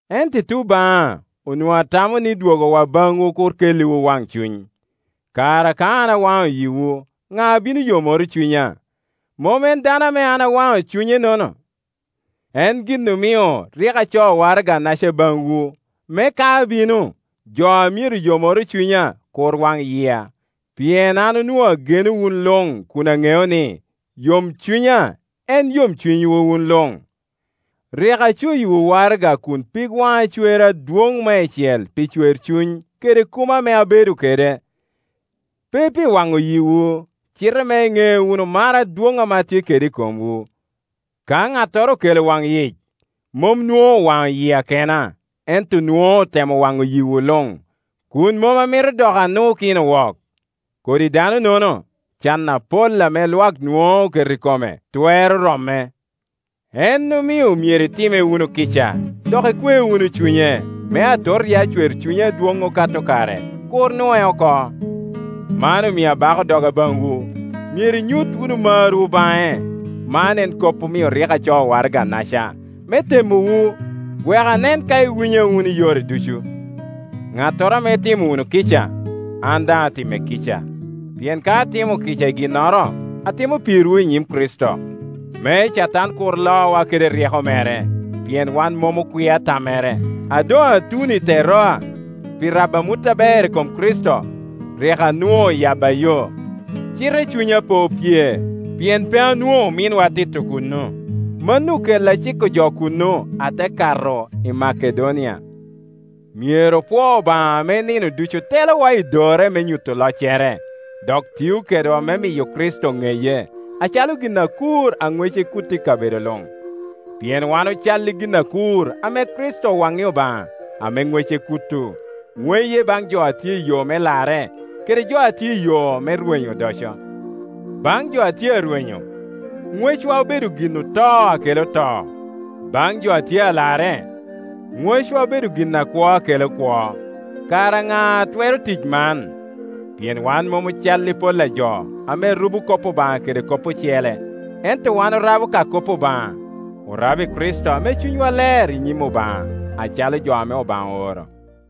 Ento i tuŋ baŋa onwoŋo atamo ni dwogowa baŋwu kur kelliwu waŋcuny. Kara ka an awaŋo yiwu, ŋa a bino yomoro cunya? Mom en dano ame an awaŋe cunyenono? En gin omio rik acoo waraga-naca baŋwu, me ka abino, jo a myero yomoro cunya kur waŋ yia; pien an onwoŋo ageno wun luŋ kun aŋeo ni, yomcunya en yomcunywu wun luŋ. Rik acoyiwu waraga kun pig waŋa cwer adwoŋ meicel pi cwercuny kede kumo ame abedo kede, pe pi waŋo yiwu, cite me iŋe wunu mar adwoŋ ame atye kede i komwu. Ka ŋattoro okelo waŋyic, mom nwoŋo owaŋo yia kena, ento nwoŋo otemo waŋo yiwu luŋ, kun mom amito dok anukino wok. Kodi dano-nono, can apol ame Iwak nwoŋo oketo i kome twero romme; en omio myero itimme wunu kica, dok ikwe wunu cunye, me atot ya cwercunye adwoŋ okato kare kur nue oko. Man omio abako doga baŋwu, myero inyut wunu marwu baŋe. Man en kop omio rik acoo waraganaca, me temowu, wek anen ka iwinya wunu i yore ducu. Ŋattoro ame itimo wunu kica, an daŋ atimme kica. Pien ka atimo kica i ginnoro, atimo pirwu i nyim Kricito, me Catan kur lowa kede ryeko mere, pien wan mom okwia tammere. A doŋ atuno i Teroa pi rabo amut aber i kom Kricito, rik anwoŋo oyabba yo; cite cunya pe opye, pien pe anwoŋo ominwa Tito kuno. Mano okela ciko jo kuno, ate kato i Makedonia. Myero opwou Obaŋa ame nino ducu telowa i dorre me nyuto loccere, dok tio kedwa me miyo Kricito ŋeye, acalo gin akur a ŋwece kuto i kabedo luŋ. Pien wan ocal i gin akur ame Kricito owaŋŋi Obaŋa, ame ŋwece kuto, ŋweye baŋ jo a tye i yo me larre kede jo a tye i yo me rwenyo odoco. Baŋ jo a tye arwenyo, ŋwccwa obedo gin oto a kela to; baŋ jo a tye a larre, ŋewcwa obedo gin akwo a kela kwo. Kara ŋa a twero tic man? Pien wan mom ocal i pol a jo, ame rubo kop Obaŋa kede kop ocele; ento wan orabo ka kop Obaŋa, orabo i Kricito ame cunywa ler i nyim Obaŋa, acalo jo ame Obaŋa ooro.